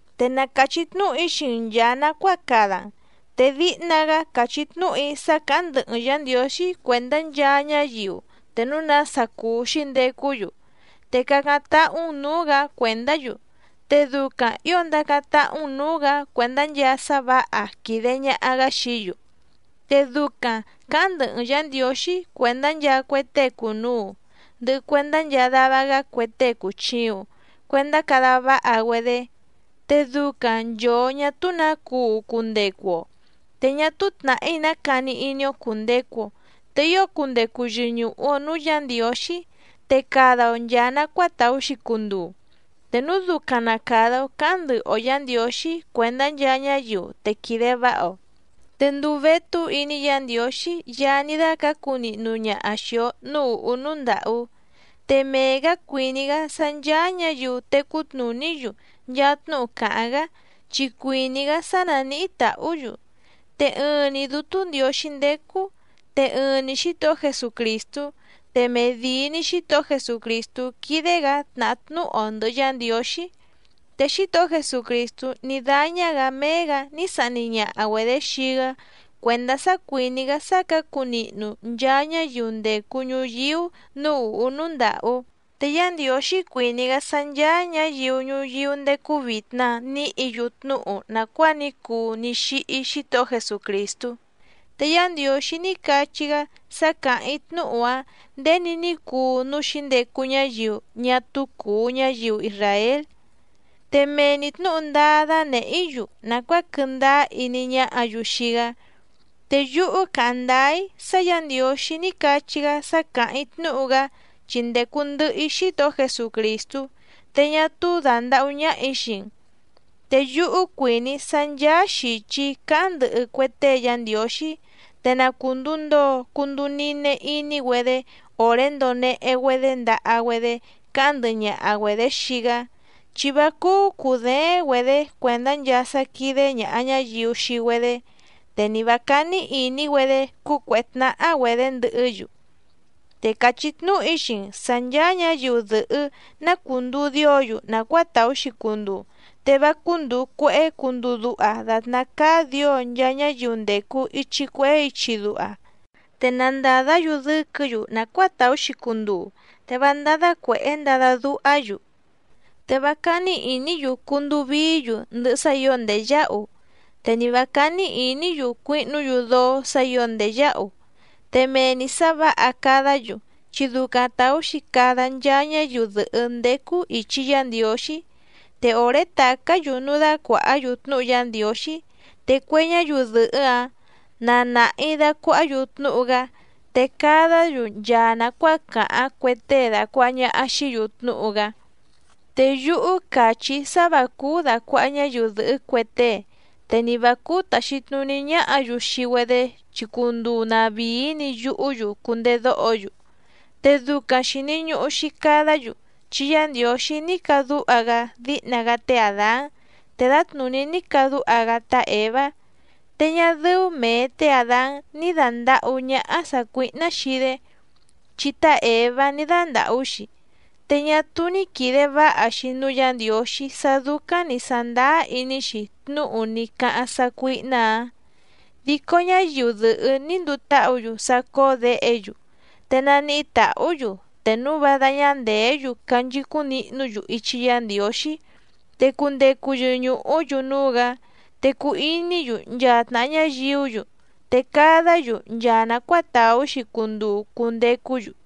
Te na càchí tnúhu‑í xii‑n nchàa nacuáa cada‑n. Te díhna‑gá càchí tnúhu‑í sá cǎháⁿ ndɨhɨ‑n Yǎ Ndiǒxí cuèndá nchaa ñáyiu te núu nása cùu xíndecú‑yu, te cácáⁿ táhú‑n nǔú‑gǎ cuèndá‑yu, te ducaⁿ ǐo ndacáⁿ táhú‑n nǔú‑gǎ cuèndá nchaa sá vǎha quìde ñaha‑gá xií‑yu. Te ducaⁿ cǎháⁿ ndɨhɨ‑n Yǎ Ndiǒxí cuèndá nchaa cue tée cùnuu ndɨhɨ cuendá nchaa dava‑gá cue tée cùchiuⁿ cuendá cada váha‑güedé, te ducaⁿ nchòo ñá túú nǎ cuu cundecu‑o, te ñá túú tnàhí ná cani iní‑ó cùndecu‑o, te ío cundecu yɨñùhu‑o núú Yǎ Ndiǒxí, te cada‑o nchàa nacuáa tàú‑xi cunduu. Te núu ducaⁿ na càda‑o cáháⁿ ndɨhɨ‑o Yǎ Ndiǒxí cuèndá nchaa ñáyiu te quìde váha‑o, te ndùu vétú iní Yǎ Ndiǒxí Yaá ní dácǎcu nihnu ñaha xìi‑o núú ùhú núú ndàhú. Te mee‑gǎ cuìní‑gá sá ncháá ñǎyiu tecú tnùní‑yu nchaa tnúhu càháⁿ‑gá, chi cuìní‑gá sá nánìhí tàhú‑yu. Te ɨɨⁿ‑ni Dútú Ndiǒxí ndécú, te ɨɨⁿ‑ni Xítohó Jesucrìstú, te medìi‑ni Xítohó Jesucrìstú quídé‑gǎ tnàhá tnúhu‑o ndɨ̀hɨ Yá Ndiǒxí. Te Xítohó Jesucrìstú ní dáñá‑gǎ méé‑gǎ ní sahni ñaha‑güedě xii‑gá cuèndá sá cuìní‑gá sá cǎcu nihnu nchaa ñáyiu ndècu ñuyíú nǔú ùhú núú ndàhú. Te Yá Ndiǒxí cuìní‑gá sá ncháá ñǎyiu ñuyíú ndécú vìtna níhǐ‑yu tnúhu nàcuáa ní cuu ní xíhí Xítohó Jesucrìstú. Te Yá Ndiǒxí ní cachí‑gá sá càháⁿ‑í tnúhu‑áⁿ nděni ní cuu núú xǐndecu ñáyiu ñá túú cùu ñáyiu isràél, te mee‑ni tnǔhu ndáá dánèhé‑í‑yu nàcuáa quɨndáá iní ñáhǎ‑yu xii‑gá, te yúhú càháⁿ ndáá‑í sá Yǎ Ndiǒxí ní cachí‑gá sá càháⁿ‑í tnúhu‑gá chi ndècu ndɨhɨ‑í Xítohó Jesucrìstú, te ñá túú dàndahú ñáhà‑í xii‑n. Te yúhú cuìní‑í sá ncháá xìchi cáháⁿ ndɨhɨ cue tée Yá Ndiǒxí, te na cùnduu ndoo cunduu nine iní‑güedé òré ndonehe‑güedé ndaha‑güedé cáháⁿ ndɨhɨ ñaha‑güedě xii‑gá, chi vá cúú cùdééⁿ‑güedě cuèndá nchaa sá quídé ñàha ñáyiu xii‑güedé, te ni vǎ cání ìní‑güedé cúcuèhé tnáhá‑güedě ndɨhɨ́‑yu. Te càchí tnúhu‑í xii‑n sǎ ncháá ñǎyiu dɨ̀hɨ́ ná cùnduu dío‑yu nàcuáa tàú‑xi cunduu, te vá cúndùu cuehé cunduu duha dàtná cáá dǐo nchaa ñáyiu ndècu ichi cuehé ichi duha, te na ndàdá‑yu dɨ́quɨ̌‑yu nàcuáa tàú‑xi cunduu, te vá ndádá cuèhé ndada duhá‑yu, te vá cání ìní‑yu cunduu vií‑yu ndɨhɨ sá ǐo ndèyáhu, te ni vǎ cání ìní‑yu cuihnú‑yu dóó sǎ ǐo ndèyáhu. Te mee‑ni sǎ vǎha cadá‑yu, chi ducaⁿ tàú‑xi cada nchaa ñáyiu dɨ̀hɨ́ ndécú ìchi Yá Ndiǒxí. Te òré tàcá‑yu núú dácuàhá‑yu tnúhu Yá Ndiǒxí, te cue ñáyiu dɨ̀hɨ́‑áⁿ na nàhi dacuahá‑yu tnúhu‑gá, te cadá‑yu nchaa nàcuáa càháⁿ cue tée dàcuaha ñaha xií‑yu tnúhu‑gá. Te yúhú càchí‑í sá vǎ cúú dàcuaha ñáyiu dɨ̀hɨ́ cue tée, te ni vǎ cúú tàxi tnuní ñáhǎ‑yu xii‑güedé chi cunduu tnàvíí‑ni yuhú‑yu cundedóho‑yu. Te ducaⁿ xìni ñuhu‑xi cadá‑yu, chi Yá Ndiǒxí ní cadúha‑gá díhna‑gá té Àdán te dǎtnùní ní cadúha‑gá tá Èvá. Te ñá dɨ́ú mèe té Àdán ní dàndahú ñáhá sàcuíhná xii‑dé, chi tá Èvá ní dándàhú‑xi, te ñá túú ní quìde váha‑xi núú Yǎ Ndiǒxí sá dúcáⁿ nǐ sándáá iní‑xi tnúhu ní cáháⁿ sácuíhná‑ǎⁿ. Dico ñáyiu dɨ̀hɨ́ ní nduu táhǔ‑yu sá cóó děhe‑yu, te naníhí tàhú‑yu te núu vá dáñá ndèé‑yu canchicúⁿ nihnú‑yu ichi Yá Ndiǒxí, te cundecu yɨñùhú‑yu núú‑gǎ, te cuu iní‑yu nchaa tnàha ñáyiú‑yu, te cadá‑yu nchaa nàcuáa tàú‑xi cunduu cundecú‑yu.